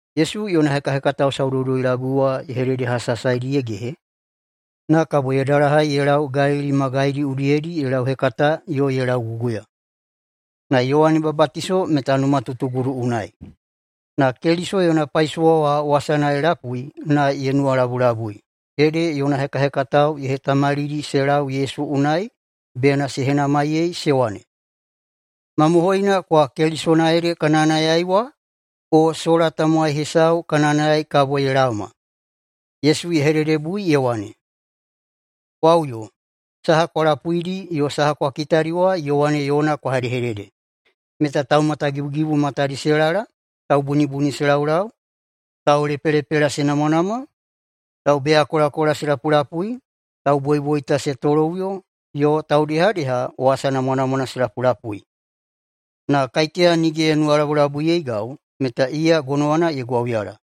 Yesu yona hekahekatao saudoudoi-labui wa ye hededehasahasaidi ye gehe, na kabo ye dalahai ye lau Galili magaidi udiyedi ye lauhekata yo ye lauguguya. Na Yowane Babatiso meta numatutugudu unai, na Keliso yona paisowa wa wasana ye lapui na ye nuwalabulabui. Ede yona hekahekatao ye hetamalidi se lau Yesu unai bena se henamaiyei se wane, “Mamohoina kowa Kelisona ede ka nayanayai wa, o sola tamowai hesau ka nayanayai kabo ye laoma?” Yesu ye hededebui ye wane, “Kwa uyo na saha kwa lapuidi yo kwa kitadi wa Yowane yona kwa hedehedede, meta taumatagibugibu matadi se lala, taubunibuni se laulau, taulepelepela se namwanamwa, taubeyakolakola se lapulapui, tauboiboita se toloꞌuyo, yo taudehadeha wasa namwanamwana se lapulapui. Na kaiteya nige ye nuwalabulabuiyeigau, meta iya gonowana ye gwauyala.”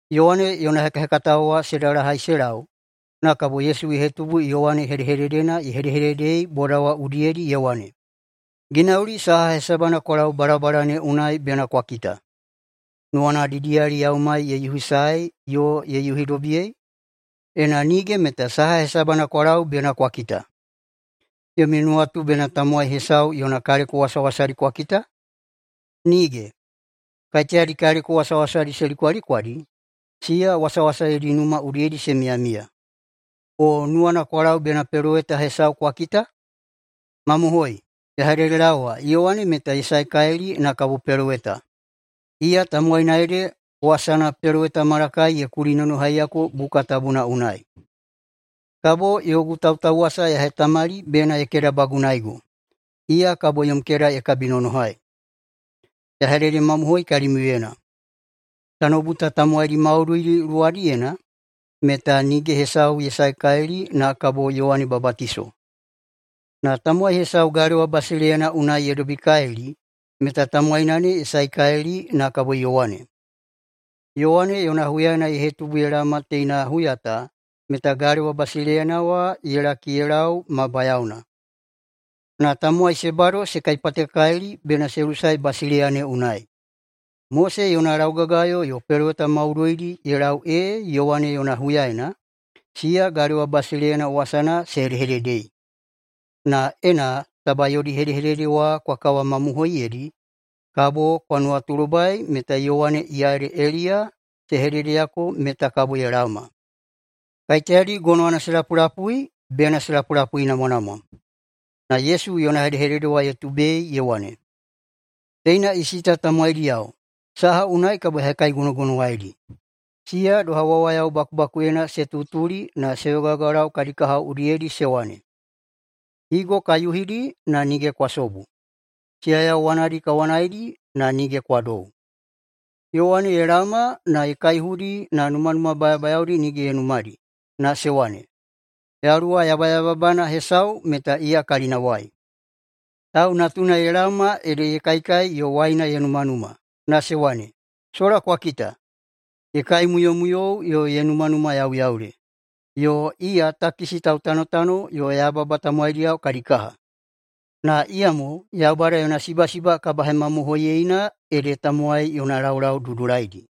Yowane yona hekahekatao wa se dalahai se lau, na kabo Yesu ye hetubu Yowane hedehededena ye hedehededei boda wa udiyedi, ye wane, “Ginauli saha hesabana kwa lau balabala ne unai bena kwa kita? Nuwana didiyali yaumai ye yuhisaei yo ye yuhidobiyei? Ena nige meta saha hesabana kwa lau bena kwa kita? Yomi nuwatu bena tamowai hesau yona kaleko wasawasadi kwa kita? Nige! Kaiteyadi kaleko wasawasadi se likwalikwadi, siya wasawasa yodi numa udiyedi se miyamiya. O nuwana kwa lau bena peloweta hesau kwa kita? Mamohoi, ya hededelaowa Yowane meta ye saekalili na kabo peloweta. Iya tamowaina ede wasana [peloweta Malakai] ye kulinonohaiyako buka tabuna unai: ‘Kabo yogu tautauwasa ya hetamali bena ye kedabagunaego. Iya kabo yom keda ye kabinonohai.’ Ya hededemamohoi kalimiuyena: Tanoubu ta tamowaidi maudoidi luwadiyena meta nige hesau ye saekalili na kabo Yowane Babatiso. Na tamowai hesau galewa basileiyana unai ye dobikalili, meta tamowaina ne ye saekalili na kabo Yowane. Yowane yona huyaena ye hetubu ye laoma teina huya ta meta galewa basileiyana wa ye laki ye lau ma bayaona, na tamowai se bado se kaipatekalili bena se lusae basileiya ne unai. Mose yona laugagayo yo peloweta maudoidi ye lau ee Yowane yona huyaena, siya Galewa basileiyana wasana se hedehededei. Na ena taba yodi hedehedede wa kwa kawamamohoiyeidi, kabo kwa nuwatulobai meta Yowane iya ede Eliya se hededeyako meta kabo ye laoma. Kaiteyadi gonowana se lapulapui bena se lapulapuinamwanamwa!” [Na Yesu yona hedehedede ye tubei ye wane,] “Teina isi ta tamowaidiyao, saha unai kabo ya hekaigonogonowaidi? Siya doha wawayao bakubakuyena se tutuli na se yogayogalau kadi kahao udiyedi se wane, ‘Higo ka yuhidi, na nige kwa sobu. Siyayau wanadi ka wanaidi, na nige kwa dou.’ Yowane ye laoma na ye kaihudi na numanuma bayabayaodi nige ye numadi, na se wane, ‘Yaluwa yabayababana hesau meta iya kalinawai.’ Tau Natuna ye laoma ede ye kaikai yo waina ye numanuma, na se wane, ‘Sola kwa kita, ye kaimuyomuyou yo ye numanumayauyaule! Yo iya takisi tautanotano yo yababa tamowaidiyao kadi kaha!’ Na iyamo Yaubada yona sibasiba kabahemamohoiyeina ede tamowai yona laulau dudulaidi.”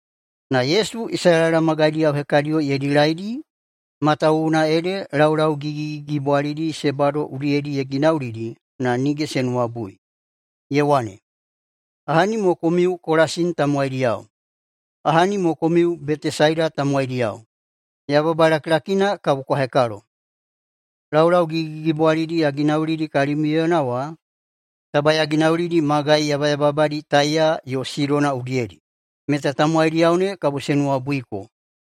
Na Yesu Isalaela magaidiyao hekadiyo ye dilaidi, matawuwuna ede laulau gigigigibwalidi se bado udiyedi ye ginaulidi, na nige se nuwabui. Ye wane, “Ahani mo komiu, Kolasini tamowaidiyao! Ahani mo komiu Betesaida tamowaidiyao! [Yababa lakilakina kabo kwa hekalo.] Laulau gigigigibwalidi ya ginaulidi kalimiuyena wa, taba ya ginaulidi magai yabayababadi Taiya yo Sidona udiyedi, meta tamowaidiyao ne kabo se nuwabuiko,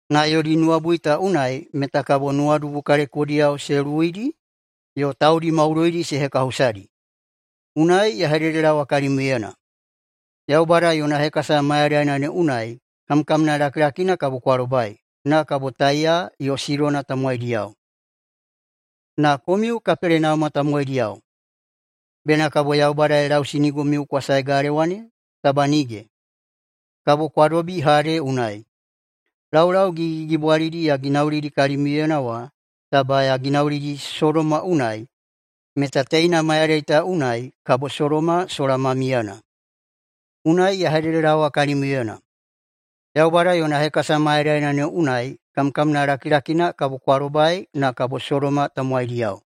na yodi nuwabui ta unai meta kabo nuwadubu kalekodiyao se luwuidi yo taudi maudoidi se hekahusadi. Unai ya hededelaowa kalimiuyena: Yaubada yona hekasa mayadaina ne unai kamkamna lakilakina kabo kwa lobai, na kabo Taiya yo Sidona tamowaidiyao. Na komiu Kapelenauma tamowaidiyao, bena kabo Yaubada ye lausinigomiu kwa sae galewa ne? Taba nige! Kabo kwa dobi Hade unai! Laulau gigigigibwalidi ya ginaulidi kalimiuyena wa, taba ya ginaulidi Sodoma unai, meta teina mayadai ta unai kabo Sodoma sola ma miyana. Unai ya hededelaowa kalimiuyena: Yaubada yona hekasa mayadaina ne unai kamkamna lakilakina kabo kwa lobai, na kabo Sodoma tamowaidiyao.”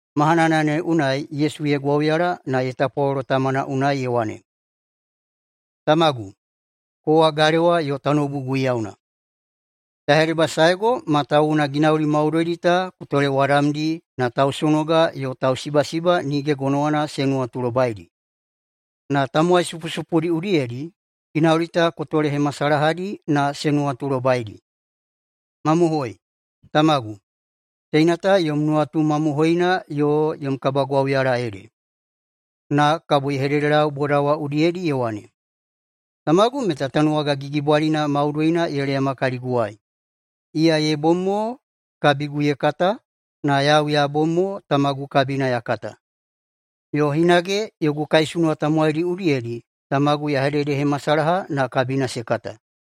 Mahanana ne unai Yesu ye gwauyala na ye tapwalolo Tamana unai ye wane, “Tamagu, kowa galewa yo tanoubu Guiyauna. Ya hedebasaego matawuwuna ginauli maudoidi ta ku tolewadamdi na tausonoga yo tausibasiba nige gonowana se nuwatulobaidi. Na tamowai supusupudi udiyedi ginauli ta ku tolehemasalahadi na se nuwatulobaidi. Mamohoi, tamagu, teina ta yom nuwatu mamohoina yo yom kabagwauyala ede.” [Na kabo ye hededelau boda wa udiyedi ye wane,] “Tamagu meta tanuwaga gigibwalina maudoina ye leyama kaliguwai. Iya ye bom mo kabigu ye kata, na yau ya bom mo tamagu kabina ya kata, yo hinage yogu kaisunuwa tamowaidi udiyedi tamagu ya hededehemasalaha na kabina se kata.”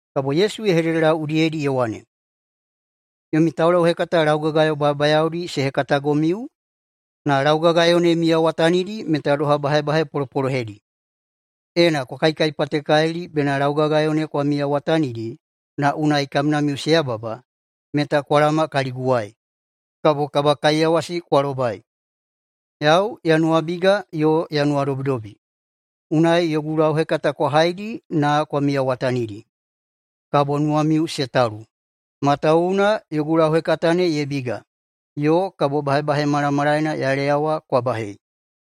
Kabo Yesu ye hededelau udiyedi ye wane, “Yomi taulauhekata laugagayo bayabayaodi se hekatagomiu, na laugagayo ne miyawatanidi meta doha bahebahe polopolohedi. Ena kwa kaikaipatekalili bena laugagayo ne kwa miyawatanidi na unai kamnamiu se yababa, meta kwa laoma kaliguwai, kabo kabakaiyawasi kwa lobai. Yau ya nuwabiga yo ya nuwadobidobi, unai yogu lauhekata kwa haidi na kwa miyawatanidi, kabo nuwamiu se talu, matawuwuna yogu lauhekata ne ye biga, yo kabo bahebahe malamalaena ya leyawa kwa bahei.”